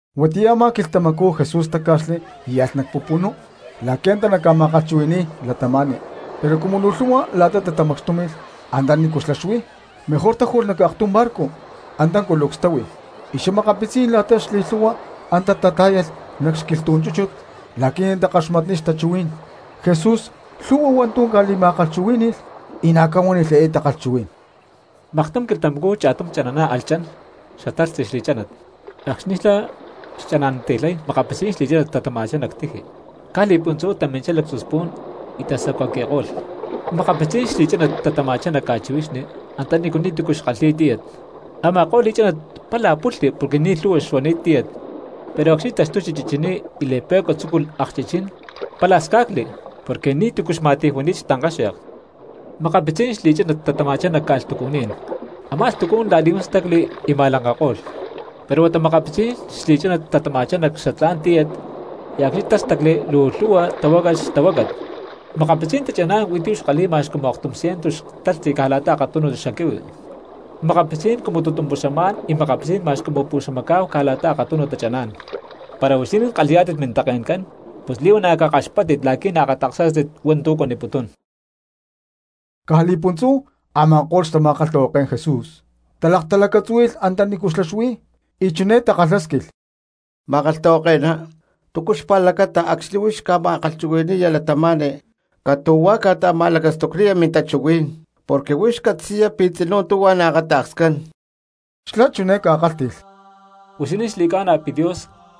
Huatiyá a̠má quilhtamacú Jesús táca̠xli y alh nac pupunú la̠qui̠ antá naca̠ma̠kalhchuhuhui̠ni̠y cristianos. Pero cumu luu lhu̠hua la̠ta tatamacxtúmi̠lh antanícu xlá xuí mejor táju̠lh nac aktum barco; antá culucs táhui y xa̠makapitzí̠n la̠ta xli̠lhu̠hua antá tatá̠yalh nac xquilhtú̠n chúchut la̠qui̠ natakaxmatniy xtachuhuí̠n. Jesús lhu̠hua hua̠ntu̠ ca̠li̠ma̠kalhchuhuí̠ni̠lh, y na̠ ca̠huánilh eé takalhchuhuí̠n: —Maktum quilhtamacú cha̠tum chana̠ná alh chan xatalhtzi xli̠chánat. Acxni̠ xlá xchana̠nanti̠lhay makapitzí̠n xli̠chánat tatama̠chá nac tiji; caj li̠puntzú taminchá lactzu spu̠n y tasacuaqui̠ko̠lh. Makapitzí̠n xli̠chánat tatama̠chá nac ca̠chihuixni antanícu ni̠tu̠cu xkalhi̠y tíyat. Ama̠ko̠lh li̠chánat pala pulhli porque ni̠ lhu̠hua xuani̠t tíyat, pero acxni̠ taxtuchi chichiní y li̠pe̠cua tzúculh akchichín pala sca̠cli porque ni̠tu̠cu xma̠ti̠ju̠ni̠t xtankáxe̠k. Makapitzí̠n xli̠chánat tatama̠chá nac ca̠lhtucuní̠n; a̠má lhtucú̠n la̠li̠huán stacli y ma̠lanka̠ko̠lh. Pero huata makapitzí̠n xli̠chánat tatama̠chá nac xatlá̠n tíyat y acxni̠ tástacli luu lhu̠hua tahuácalh xtahuácat; makapitzí̠n tachaná̠n huí tu̠ xkalhi̠y ma̠x cumu aktum ciento xtalhtzi caj la̠ta akatum xaquihui, makapitzí̠n cumu tutumpuxám y makapitzí̠n ma̠x cumu puxamacá̠hu caj la̠ta akatunu tachaná̠n. ¡Para huixinín kalhi̠yá̠tit mintake̠ncán pus li̠huana̠ cakaxpáttit la̠qui̠ naakata̠ksá̠tit hua̠ntu̠ cuaniputún! Caj li̠puntzú a̠ma̠ko̠lh xtama̠kalhtahuaké̠n Jesús talaktalacatzúhui̠lh antanícu xlá xuí y chuné takalhásquilh: —Ma̠kalhtahuake̠ná, ¿túcu xpa̠lacata acxni̠ huix ca̠ma̠kalhchuhui̠ni̠ya cristianos catu̠huá ca̠ta̠ma̠lacastucniya mintachuhuí̠n, porque huix catzi̠ya pi̠ tzinú tuhua naakata̠kscán? Xlá chiné ca̠kálhti̠lh: —Huixinín xli̠ca̠na pi̠ Dios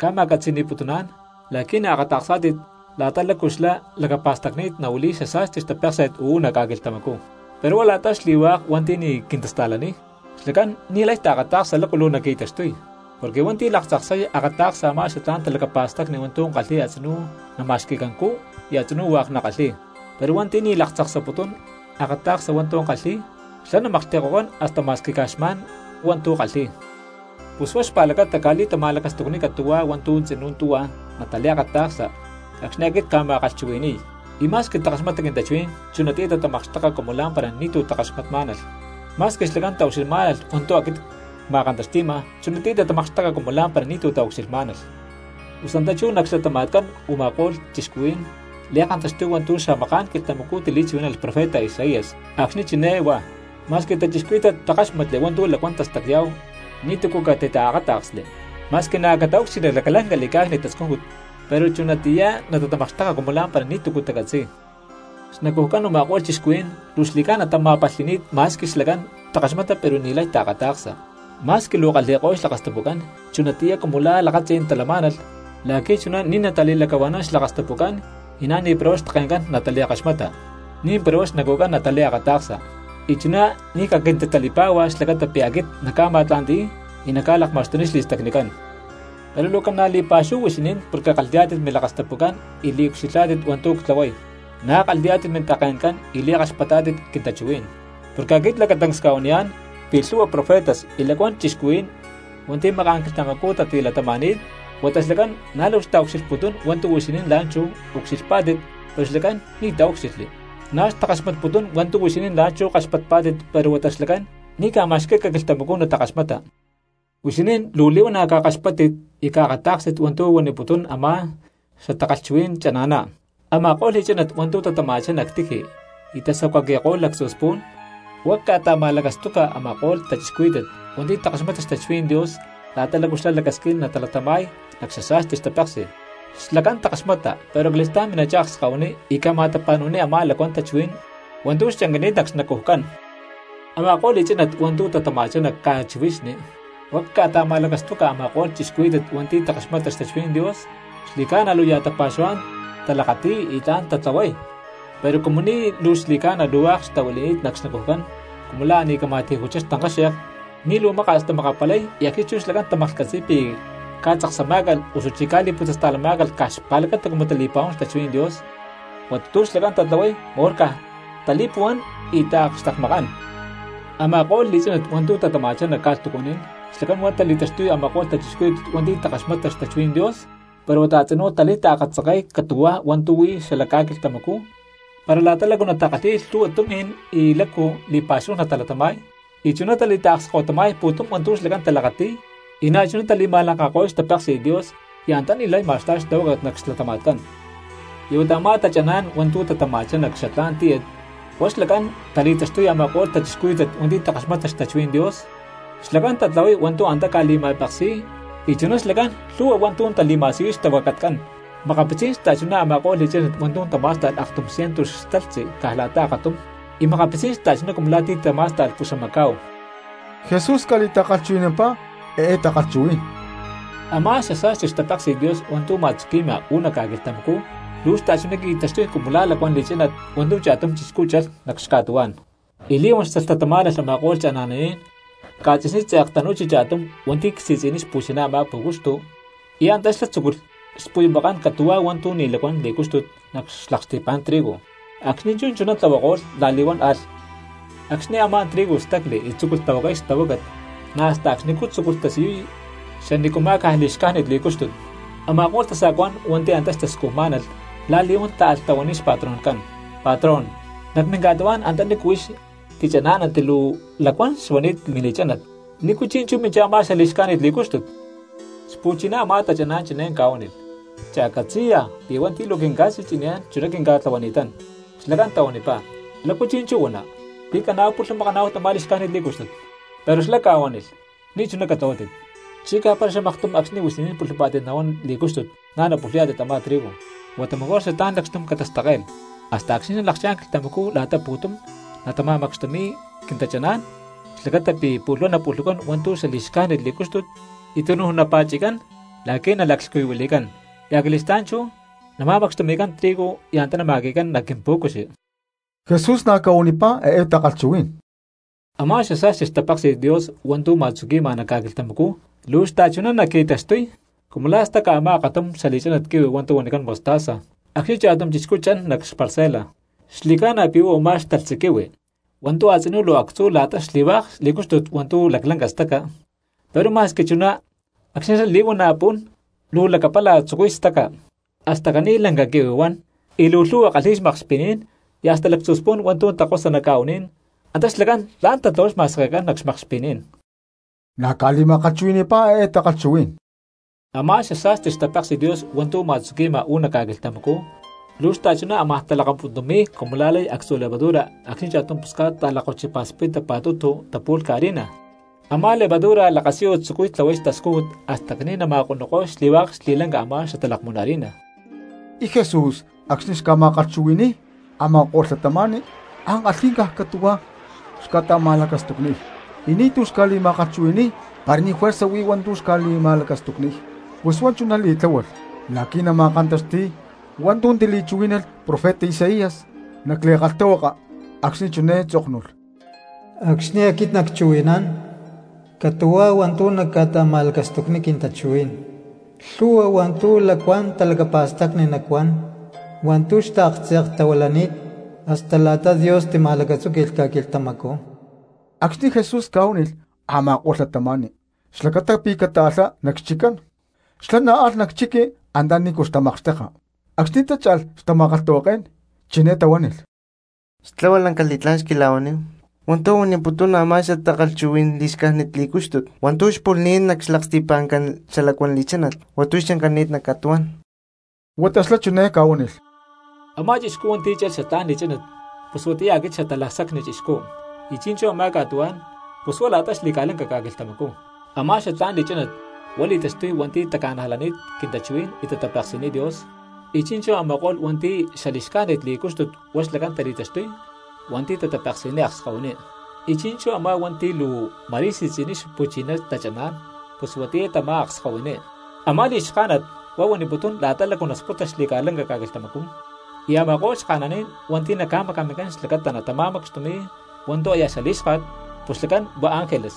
ca̠ma̠catzi̠ni̠putuná̠n la̠qui̠ naakata̠ksá̠tit la̠ta lácu xlá lacapa̠stacni̠t nahuili̠y xasa̠sti xtapéksi̠t uú nac ca̠quilhtamacú, pero huá la̠ta xli̠hua̠k hua̠nti̠ ni̠ quintasta̠laniy, xlacán ni̠lay taakata̠ksa lácu luu naqui̠taxtuy. Porque hua̠nti̠ laktzaksay akata̠ksa a̠má xatlá̠n talacapa̠stacni hua̠ntu̠ kalhi̠y a̠tzinú nama̠xqui̠cancú y a̠tzinú hua̠k nakalhi̠y; pero hua̠nti̠ ni̠ laktzaksaputún akata̠ksa hua̠ntu̠ kalhi̠y xlá namaklhti̠ko̠cán hasta ma̠squi caj xma̠n huá hua̠ntu̠ kalhi̠y. Pus huá xpa̠lacata cca̠li̠ta̠ma̠lacastucniy catu̠huá hua̠ntu̠ tzinú tuhua nataliakata̠ksa acxni̠ aquit cca̠ma̠kalhchuhui̠ni̠y, y ma̠squi takaxmata quintachuhuí̠n chunatiyá tatamakxteka cumu la̠mpara ni̠tu̠ takaxmatmá̠nalh; ma̠squi xlacán taucxilhmá̠nalh hua̠ntu̠ aquit cma̠kantaxti̠ma, chunatiyá tatamakxteka cumu la̠mpara ni̠tu̠ taucxilhmá̠nalh. Pus antá chú nac xlatama̠tcán u̠ma̠ko̠lh cristianos li̠kantaxtuy hua̠ntu̠ xamaká̠n quilhtamacú tili̠chuhuí̠nalh profeta Isaías acxni̠ chiné huá: Ma̠squi cristianos takáxmatli hua̠ntu̠ lacuán tastacya̠hu ni̠tu̠cu catitaakáta̠ksli; ma̠squi na̠ cataúcxilhli laclanca li̠cá̠cni̠t tascújut, pero chunatiyá natatamakxteka cumu la̠mpara ni̠tu̠cu tacatzi̠y. Xnacujcán u̠ma̠ko̠lh cristianos luu xli̠ca̠na tama̠palhi̠ni̠t; ma̠squi xlacán takaxmata pero ni̠lay taakata̠ksa, ma̠squi luu kalhi̠ko̠y xlakastapucán chunatiyá cumu la̠ lakatzí̠n talamá̠nalh la̠qui̠ chuná ni̠ natali̠lacahua̠nán xlakastapucán y na̠ ni̠para huá xtake̠ncán natali̠kaxmata, ni̠mpara huá xnacujcán nataliakata̠ksa; y chuná ni̠ caquintitali̠pá̠hua xlacata pi̠ aquit nacca̠ma̠tla̠nti̠y y nacca̠lakma̠xtuniy xli̠stacnicán. ’Pero luu ca̠na̠ li̠pa̠xúhu huixinín porque kalhi̠yá̠tit milakastapucán y liucxilhá̠tit hua̠ntu̠ ctlahuay, na̠ kalhi̠yá̠tit mintake̠ncán y li̠kaxpatá̠tit quintachuhuí̠n. Porque aquit lacatancs cca̠huaniyá̠n pi̠ lhu̠hua profetas y lacuán cristianos hua̠nti̠ maká̠n quilhtamacú tatilatama̠ni̠t huata xlacán na̠ luu xtaucxilhputún hua̠ntu̠ huixinín la̠nchú ucxilhpá̠tit pero xlacán ni̠ taúcxilhli; na̠ xtakaxmatputún hua̠ntu̠ huixinín la̠nchú kaxpatpá̠tit pero huata xlacán ni̠ ca̠ma̠xquí̠calh quilhtamacú natakaxmata. ’Huixinín luu li̠huana̠ cakaxpáttit y caakatá̠kstit hua̠ntu̠ huaniputún a̠má xatakalhchuhuí̠n chana̠ná: Ama̠ko̠lh li̠chánat hua̠ntu̠ tatama̠chá nac tiji y tasacuaqui̠ko̠lh lactzu spu̠n, huá cca̠ta̠ma̠lacastuca a̠ma̠ko̠lh cristianos hua̠nti̠ takaxmata xtachuhuí̠n Dios la̠ta lácu xlá lacasquín natalatama̠y nac xasa̠sti xtapéksi̠t; xlacán takaxmata pero acali̠stá̠n mina̠chá akskahuiní y ca̠ma̠tapa̠nu̠niy a̠má lacuán tachuhuí̠n hua̠ntu̠ xchancani̠t nac xnacujcán. Ama̠ko̠lh li̠chánat hua̠ntu̠ tatama̠chá nac ca̠lakchihuixni, huá cca̠ta̠ma̠lacastuca a̠ma̠ko̠lh cristianos hua̠nti̠ takaxmata xtachuhuí̠n Dios, xli̠ca̠na luu ya̠ tapa̠xuhuá̠n talakati̠y y tla̠n tatlahuay. Pero cumu ni̠ luu xli̠ca̠na hua̠k xtahuili̠ni̠t nac xnacujcán cumu la̠ a̠ ni̠ cama̠ti̠ju̠chá xtankáxe̠k, ni̠ luu maka̠s tamakapalay y acxni̠ chú xlacán tamaklhcatzi̠y pi̠ ca̠tzaksamá̠calh osuchí ca̠li̠putzasta̠lamá̠calh caj xpa̠lacata cumu tali̠pa̠huán xtachuhuí̠n Dios, huata tu̠ xlacán tatlahuay mejor caj tali̠puhuán y taakxtekmakán. Ama̠ko̠lh li̠chánat hua̠ntu̠ tatama̠chá nac ca̠lhtucuní̠n xlacán huá tali̠taxtuy a̠ma̠ko̠lh cristianos hua̠nti̠ takaxmata xtachuhuí̠n Dios pero huata a̠tzinú tali̠taakatzanke̠y catu̠huá hua̠ntu̠ huí xala ca̠quilhtamacú para la̠ta lácu natakalhi̠y lhu̠hua tumi̠n y lácu li̠pa̠xúhu natalatama̠y, y chuná tali̠taakskahuitama̠y pu̠tum hua̠ntu̠ xlacán talakati̠y, y na̠chuná chú tali̠ma̠lankako̠y xtapéksi̠t Dios y antá ni̠lay ma̠sta̠y xtahuácat nac xlatama̠tcán. Y huata a̠má tachaná̠n hua̠ntu̠ tatama̠chá nac xatlá̠n tíyat huá xlacán tali̠taxtuy a̠ma̠ko̠lh cristianos hua̠nti̠ takaxmata xtachuhuí̠n Dios, xlacán tatlahuay hua̠ntu̠ antá ca̠li̠ma̠peksi̠y y chuná xlacán lhu̠hua hua̠ntu̠ tali̠ma̠siyuy xtahuacatcán. Makapitzí̠n xta̠chuná a̠ma̠ko̠lh li̠chánat hua̠ntu̠ tamá̠sta̠lh aktum cientu xtalhtzi caj la̠ta akatum, y makapitzí̠n xta̠chuná cumu la̠ ti̠ tamá̠sta̠lh puxamacá̠hu. Jesús ca̠li̠ta̠kalhchuhui̠nampá eé takalhchuhuí̠n: —Amá xasa̠sti xtapéksi̠t Dios hua̠ntu̠ ma̠tzuqui̠ma uú nac ca̠quilhtamacú luu xta̠chuná qui̠taxtuy cumu la̠ lacuán li̠chánat hua̠ntu̠ cha̠tum chixcú chalh nac xca̠tuhuá̠n. Y li̠huán xtalhtatamá̠nalh a̠ma̠ko̠lh chana̠naní̠n ca̠tzi̠sní tze̠k tanu̠chi cha̠tum hua̠nti̠ csi̠tzi̠niy xpu̠chiná a̠má pú̠cuxtu y antá xlá tzúculh xpuyumakán catu̠huá hua̠ntu̠ ni̠ lacuán li̠cúxtut nac xlaksti̠pa̠ncán trigo; acxni̠ chuná tlahuako̠lh la̠li̠huán alh. Acxni̠ a̠má trigo stacli y tzúculh tahuacay xtahuácat na̠ hasta acxnicú tzúculh tasiyuy xanícuma̠ caj li̠xcájnit li̠cúxtut. Ama̠ko̠lh tasa̠cuá̠n hua̠nti̠ antá xtascujmá̠nalh la̠li̠huán táalh tahuaniy xpatroncán: “Patrón, nac minca̠tuhuá̠n antanícu huix tichaná̠nanti luu lacuán xuani̠t mili̠chánat, ¿nícu chi̠nchú minchá a̠má xali̠xcájnit li̠cúxtut?” Xpu̠chiná a̠má tachaná̠n chiné ca̠huánilh: “Cha̠catzi̠ya pi̠ hua̠nti̠ luu quinca̠si̠tzi̠niyá̠n chuná quinca̠tlahuani̠tán.” Xlacán tahuanipá: “¿Lácu chi̠nchú huana, pi̠ caná̠hu pulhumakaná̠hu tamá li̠xcájnit li̠cúxtut?” Pero xlá ca̠huánilh: “Ni̠chuná catlahuátit, chicá para xamaktum acxni̠ huixinín pulhupá̠tit nahuán li̠cúxtut na̠ napulhuyá̠tit a̠má trigo. Huata mejor xatlá̠n lacxtum catastacke̠lh hasta acxni̠ nalakchá̠n quilhtamacú la̠ta pu̠tum natama̠macxtumi̠y quintachaná̠n xlacata pi̠ pu̠lh huá napulhucán hua̠ntu̠ xali̠xcájnit li̠cúxtut y tunuj napa̠chi̠cán la̠qui̠ naca̠laclhcuyuhuili̠cán, y acali̠stá̠n chú nama̠macxtumi̠cán trigo y antá nama̠qui̠cán nac quimpú̠cuxi.” Jesús na̠ ca̠huanipá eé takalhchuhuí̠n: —Amá xasa̠sti xtapéksi̠t Dios hua̠ntu̠ ma̠tzuqui̠ma nac ca̠quilhtamacú luu xta̠chuná naqui̠taxtuy cumu la̠ staca a̠má aktum xali̠chánat quihui hua̠ntu̠ huanicán mostaza acxni̠ cha̠tum chixcú chan nac xparcela. Xli̠ca̠na pi̠ huá u̠má xtalhtzi quihui hua̠ntu̠ a̠tzinú luu actzú la̠ta xli̠hua̠k li̠cúxtut hua̠ntu̠ laclanca tastaca, pero ma̠squi chuná acxni̠ xlá li̠huana̠ pún luu lacapala tzucuy staca, hasta caní lanca quihui huán; y luu lhu̠hua kalhi̠y xmakxpi̠ní̠n, y hasta lactzu spu̠n hua̠ntu̠ takosa nac ca̠u̠ní̠n antá xlacán tla̠n tlahuay xma̠sekecán nac xca̠makxpi̠ní̠n. Na̠ ca̠li̠ma̠kalhchuhui̠ni̠pá eé takalhchuhuí̠n: —Amá xasa̠sti xtapéksi̠t Dios hua̠ntu̠ ma̠tzuqui̠ma uú nac ca̠quilhtamacú luu xta̠chuná ámaj talakapuntumi̠y cumu la̠ lay actzu levadura acxni̠ cha̠tum pusca̠t ta̠lakkochipa̠spita pa̠tutu tapu̠lhca harina; a̠má levadura lakasiyu tzucuy tlahuay xtascújut hasta caní nama̠konuko̠y xli̠hua̠k xli̠lanca a̠má xatalakmún harina. Y Jesús acxni̠ xca̠ma̠kalhchuhui̠ni̠y cristianos ankalhí̠n caj catu̠huá xca̠ta̠ma̠lacastucniy, y ni̠tu̠ xca̠li̠ma̠kalhchuhui̠ni̠y para ni̠ juerza huí tu̠ naca̠ta̠ma̠lacastucniy. Pus huá chuná li̠tláhualh la̠qui̠ nama̠kantaxti̠y hua̠ntu̠ tili̠chuhuí̠nalh profeta Isaías nac li̠kalhtahuaka acxni̠ chiné tzóknulh: Acxni̠ aquit nacchuhui̠nán, catu̠huá hua̠ntu̠ nacca̠ta̠ma̠lacastucniy quintachuhuí̠n; lhu̠hua hua̠ntu̠ lacuán talacapa̠stacni nacuán hua̠ntu̠ xtaaktze̠ktahuilani̠t hasta la̠ta Dios tima̠lacatzúqui̠lh ca̠quilhtamacú. Acxni̠ Jesús ca̠huánilh a̠ma̠ko̠lh cristianos xlacata pi̠ cataalhá nac xchiccán xlá na̠ alh nac chiqui antanícu natamakxteka. Acxni̠ tácha̠lh, xtama̠kalhtahuaké̠n chiné tahuánilh: —Xtlahua lanca li̠tlá̠n xquila̠huaníhu hua̠ntu̠ huaniputún a̠má xatakalhchuhuí̠n li̠xcájnit li̠cúxtut hua̠ntu̠ xpulhni̠t nac xlaksti̠pá̠n xalacuán li̠chánat hua̠ntu̠ xchancani̠t nac ca̠tuhuá̠n. Huata xlá chiné ca̠huánilh: —Amá chixcú hua̠nti̠ chalh xatlá̠n li̠chánat pus huatiyá aquit Xatalacsacni Chixcú. Y chi̠nchú a̠má ca̠tuhuá̠n pus huá la̠ta xli̠ca̠lanca ca̠quilhtamacú. Amá xatlá̠n li̠chánat huá tali̠taxtuy hua̠nti̠ taca̠najlani̠t quintachuhuí̠n y tatapeksi̠niy Dios; y chi̠nchú a̠ma̠ko̠lh hua̠nti̠ xali̠xcájnit li̠cúxtut huá xlacán tali̠taxtuy hua̠nti̠ tatapeksi̠niy akskahuiní. Y chi̠nchú a̠má hua̠nti̠ luu ma̠rí si̠tzi̠niy xpu̠chiná tachaná̠n pus huatiyá tamá akskahuiní. Amá li̠xká̠nat huá huaniputún la̠ta lácu nasputa xli̠ca̠lanca ca̠quilhtamacú; y a̠ma̠ko̠lh xka̠naní̠n hua̠nti̠ naca̠macamincán xlacata natama̠macxtumi̠y hua̠ntu̠ aya xalí̠xka̠t pus xlacán huá ángeles.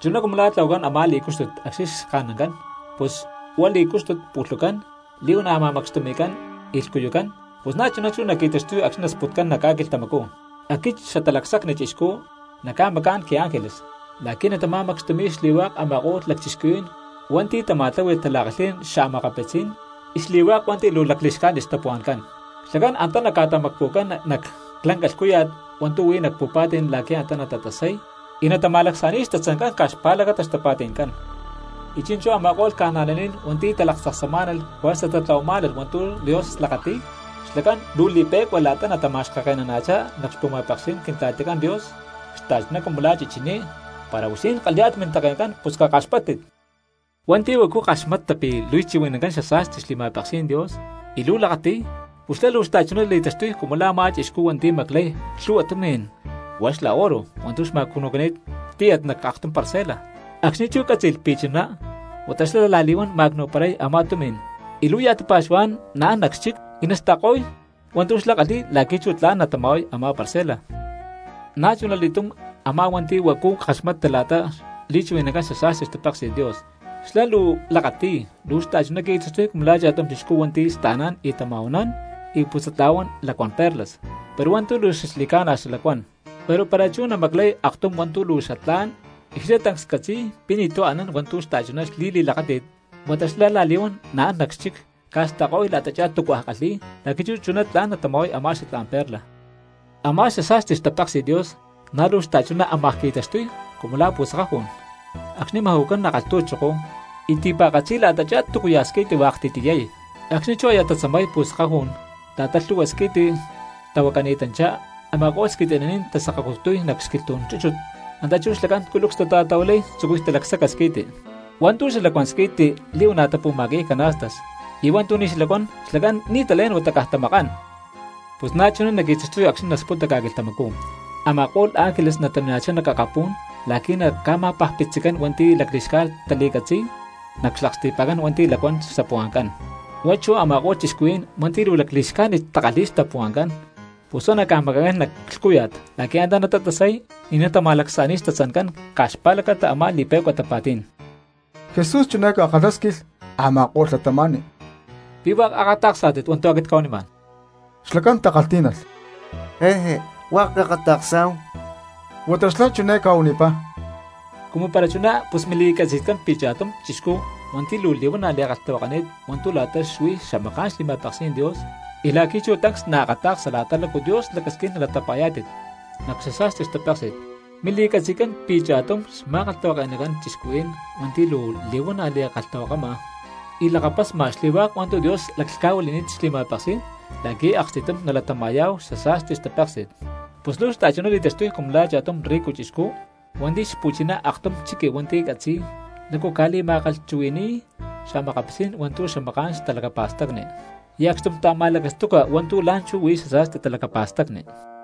Chuná cumu la̠ tlahuacán a̠má li̠cúxtut acxni̠ xka̠nancán, pu̠lh huá li̠cúxtut pulhucán, li̠huana̠ ma̠macxtumi̠cán y lhcuyucán, pus na̠chuná chú naqui̠taxtuy acxni̠ nasputcán nac ca̠quilhtamacú. Aquit Xatalacsacni Chixcú nacca̠macá̠n quiángeles la̠qui̠ natama̠macxtumi̠y xli̠hua̠k a̠ma̠ko̠lh lacchixcuhuí̠n hua̠nti̠ tama̠tlahui̠y tala̠kalhí̠n xa̠makapitzí̠n xta̠cristianoscán, y xli̠hua̠k hua̠nti̠ luu lacli̠xcájnit xtapuhua̠ncán. Xlacán antá naca̠tamacpu̠cán nac lanca lhcúya̠t hua̠ntu̠ huí nac pu̠pa̠tí̠n la̠qui̠ antá natatasay y natama̠lacsa̠ni̠y xtatzancán caj xpa̠lacata xtapa̠ti̠ncán. Y chi̠nchú a̠ma̠ko̠lh cristianos hua̠nti̠ talaktzaksamá̠nalh juerza tatlahuamá̠nalh hua̠ntu̠ Dios lakati̠y xlacán luu li̠pe̠cua la̠ta natamacaxkake̠nana̠chá nac xpu̠ma̠peksí̠n Quintla̠ticán Dios xta̠chuná cumu la̠ chichiní. ¡Para huixinín kalhi̠yá̠tit mintake̠ncán pus cakaxpáttit! ’Hua̠nti̠ huacu kaxmata pi̠ li̠chuhui̠nancán xasa̠sti xli̠ma̠peksí̠n Dios y luu lakati̠y pus xlá luu xta̠chuná li̠taxtuy cumu la̠ a̠má chixcú hua̠nti̠ maclay lhu̠hua tumi̠n hua̠k xla oro hua̠ntu̠ xma̠cnu̠cani̠t ctíyat nac aktum parcela. Acxni̠ chú cátzi̠lh pi̠ chuná huata xlá la̠li̠huán ma̠cnu̠paray a̠má tumi̠n y luu ya̠ tapa̠xuhuá̠n naán nac xchic y nasta̠ko̠y hua̠ntu̠ xlá xkalhi̠y la̠qui̠ chú tla̠n natama̠huay a̠má parcela. ’Na̠chunali̠túm a̠má hua̠nti̠ huacu kaxmata la̠ta li̠chuhui̠nancán xasa̠sti xtapéksi̠t Dios y xlá luu lakati̠y, luu xta̠chuná qui̠taxtuy cumu la̠ cha̠tum chixcú hua̠nti̠ sta̠nán y tama̠huanán y putzatla̠huán lacuán perlas, pero hua̠ntu̠ luu xli̠ca̠na xalacuán. Pero para chú naqui̠maclay aktum hua̠ntu̠ luu xatlá̠n y xlá tancs catzi̠y pi̠ ni̠tu̠ anán hua̠ntu̠ xta̠chuná xli̠li̠lakáti̠t, huata xlá la̠li̠huán an nac xchic, ca̠sta̠ko̠y la̠tachá túcua kalhi̠y la̠qui̠ chú chuná tla̠n natama̠huay a̠má xatlá̠n perla. ’Amá xasa̠sti xtapéksi̠t Dios na̠ luu xta̠chuná amaj qui̠taxtuy cumu la̠ pu̠sakajú̠n acxni̠ maju̠cán nac kalhtu̠choko y ti̠pa̠katzi la̠tachá túcuya̠ squi̠ti hua̠k ti̠tiyay. Acxni̠ chú aya tatzamay pu̠sakajú̠n la̠ta lhu̠hua squi̠ti xtahuacani̠tanchá a̠ma̠ko̠lh squi̠ti̠naní̠n tasakacutuy nac xquilhtú̠n chúchut, antá chú xlacán culucs talakatahuilay tzucuy talacsaca squi̠ti. Hua̠ntu̠ xalacuán squi̠ti li̠huana̠ tapu̠ma̠qui̠y canastas, y hua̠ntu̠ ni̠ xalacuán xlacán ni̠ talén huata caj tamakán. Pus na̠chuná naqui̠taxtuy acxni̠ nasputa ca̠quilhtamacú, a̠ma̠ko̠lh ángeles natamina̠chá nac akapú̠n la̠qui̠ naca̠ma̠pajpitzicán hua̠nti̠ lacli̠xcájnit tali̠catzi̠y nac xlaksti̠pa̠ncán hua̠nti̠ lacuán xtapuhua̠ncán. Huá chú a̠ma̠ko̠lh cristianos hua̠nti̠ luu lacli̠xcájnit takalhi̠y xtapuhua̠ncán pus huá naca̠maca̠ncán nac lhcúya̠t la̠qui̠ antá natatasay y natama̠lacsa̠ni̠y xtatzancán caj xpa̠lacata a̠má li̠pe̠cua tapa̠tí̠n. Jesús chiné ca̠kalhásquilh a̠ma̠ko̠lh cristianos: —¿Pi̠ hua̠k akata̠ksá̠tit hua̠ntu̠ aquit cca̠huanimá̠n? Xlacán takalhtí̠nalh: —¡Jéje, hua̠k cakata̠ksá̠hu! Huata xlá chiné ca̠huanipá: —Cumu para chuná pus mili̠catzi̠tcán pi̠ cha̠tum cristiano hua̠nti̠ luu li̠huana̠ li̠kalhtahuakani̠t hua̠ntu̠ la̠ta xuí xamaká̠n xli̠ma̠peksí̠n Dios y la̠qui̠ chú tancs naakata̠ksa la̠ta lácu Dios lacasquín nalatapa̠yá̠tit nac xasa̠sti xtapéksi̠t mili̠catzi̠tcán pi̠ cha̠tum xma̠kalhtahuake̠nacán cristianos hua̠nti̠ luu li̠huana̠ li̠kalhtahuakama y lakapasma xli̠hua̠k hua̠ntu̠ Dios laclhca̠huili̠ni̠t xli̠ma̠peksí̠n la̠qui̠ akstítum nali̠latama̠yá̠hu xasa̠sti xtapéksi̠t. Pus luu xta̠chuná li̠taxtuy cumu la̠ cha̠tum rico chixcú hua̠nti̠ xpu̠chiná aktum chiqui hua̠nti̠ catzi̠y lácu ca̠li̠ma̠kalhchuhui̠ni̠y xa̠makapitzí̠n hua̠ntu̠ xamaká̠n talacapa̠stacni y acxtum ta̠ma̠lacastuca hua̠ntu̠ la̠nchú huí xasa̠sti talacapa̠stacni.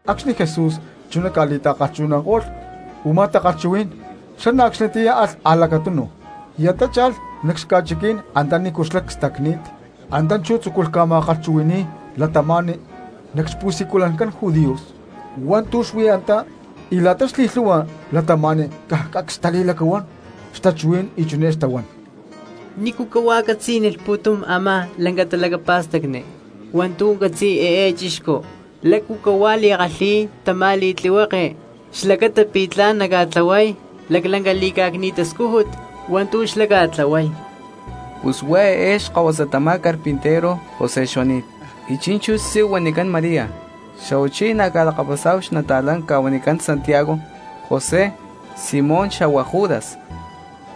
Acxni̠ Jesús chuná ca̠li̠ta̠kalhchuhui̠nanko̠lh u̠má takalhchuhuí̠n xlá na̠ acxnitiyá alh a̠lacatunu. Y antá cha̠lh nac xca̠chiquí̠n antanícu xlá cstacni̠t. Antá chú tzúculh ca̠ma̠kalhchuhui̠ni̠y cristianos nac xpu̠siculancán judíos hua̠ntu̠ xuí antá, y la̠ta xli̠lhu̠hua cristianos caj cacs xtali̠lacahuán xtachuhuí̠n y chiné xtahuán: —¿Nícu cahuá catzí̠nilh pu̠tum a̠má lanca talacapa̠stacni hua̠ntu̠ catzi̠y eé chixcú? ¿Lácu cahuá li̠kalhi̠y tamá li̠tlihueke xlacata pi̠ tla̠n naca̠tlahuay laclanca li̠cá̠cni̠t tascújut hua̠ntu̠ xlá ca̠tlahuay? Pus huá eé xkahuasa tamá carpintero José xuani̠t, y chi̠nchú xtzí huanicán María, xa̠huachí na̠ ca̠lakapasá̠hu xli̠talakapasni ca̠huanicán Santiago, José, Simón xa̠huá Judas.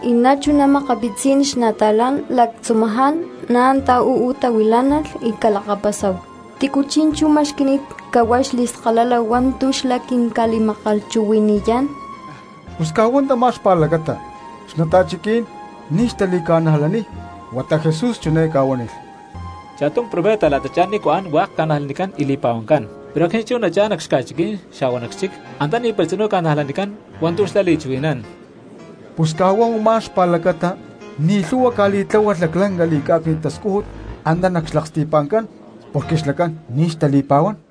Y na̠ chuná makapitzí̠n xnata̠lán lactzumaján na̠ antá uú tahuilá̠nalh y ca̠lakapasá̠hu. ¿Tícu chi̠nchú ma̠xqui̠ni̠t cahuá xli̠skalala hua̠ntu̠ xlá quinca̠li̠ma̠kalhchuhui̠ni̠yá̠n? Pus caj huá tamá xpa̠lacata xnata̠chiquí̠n ni̠ xtali̠ca̠najlaniy. Huata Jesús chiné ca̠huánilh: —Cha̠tum profeta la̠tachá nícu an hua̠k ca̠najlanicán y li̠pa̠huancán, pero acxni̠ chú cha̠n nac xca̠chiquí̠n xa̠huá nac xchic, antá ni̠para tzinú ca̠najlanicán hua̠ntu̠ xlá li̠chuhui̠nán. Pus caj huá u̠má xpa̠lacata ni̠ lhu̠hua ca̠li̠tláhualh laclanca li̠cá̠cni̠t tascújut antá nac xlaksti̠pa̠ncán porque xlacán ni̠ xtali̠pa̠huán.